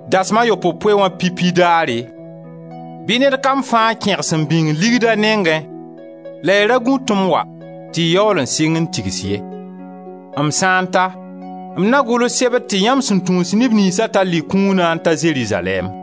Dasem a yopoe-poe wã pipi daare bɩ ned kam fãa kẽgs n bĩng ligd a nengẽ la y ra gũ tɩ m wa tɩ y yaool n sɩng n tigs ye. M sã n ta, m na gʋls sebr tɩ yãmb sẽn tũus neb niynsa tall y kũuna n ta Zerizalɛɛm;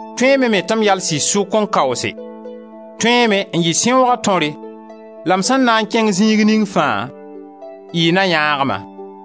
Tõeeme me tɩ m yals y sʋk n kaoose, tõeeme n yɩ sẽooga tõre la m sẽn na n kẽng zĩig ning fãa, y na yãag-ma.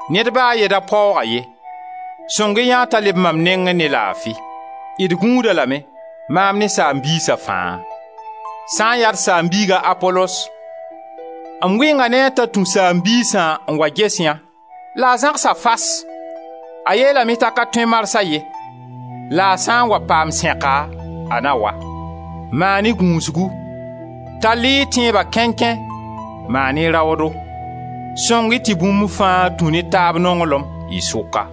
Ned ba a ye da paoog-a ye; sõng-y yã t'a leb mam nengẽ ne laafi. D gũud-a lame, maam ne saam-biisa fãa. Sã n yaa d saam-biig a Apolos, m wɩnga ne a t'a tũ saam-biisã n wa ges yã la a zãgsa fas; a yeelame t'a ka tõe marsa ye la a sã n wa paam sẽka, a na wa. Maan-y gũusgu, tall-y y tẽeba kẽnkẽ, maan-y raoodo. Sõng-y tɩ bũmb fãa tũ ne taab nonglem, y sʋka.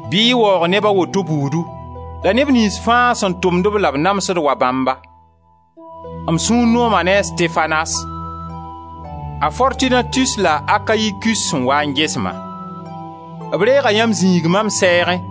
Bɩ y waoog neb a woto buudu la neb niyns fãa sẽn tʋmd-b la b namsd wa bãmba. M sũur nooma a Stefanas, a Fortunatus la a Akayikus sẽn waa n ges-ma; b reega yãmb zĩig mam sɛɛgẽ,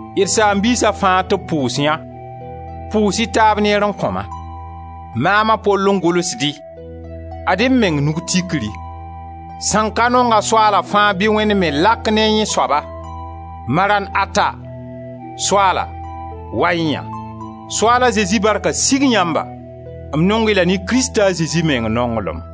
D saam-biisa fãa tɩ b pʋʋs yã; pʋʋs-y taab neer n kõ-ma! Maam a Pol n gʋlsd-y, ad-m meng nug tikri. Sẽn ka nong-a Soaala fãa bɩ Wẽnd me lak ne yẽ soaba! Maran ata! Soaala, wa-y yã! Soaala Zezi barka sig yãmba! M nong-y la ne Krista a Zezi meng nonglem.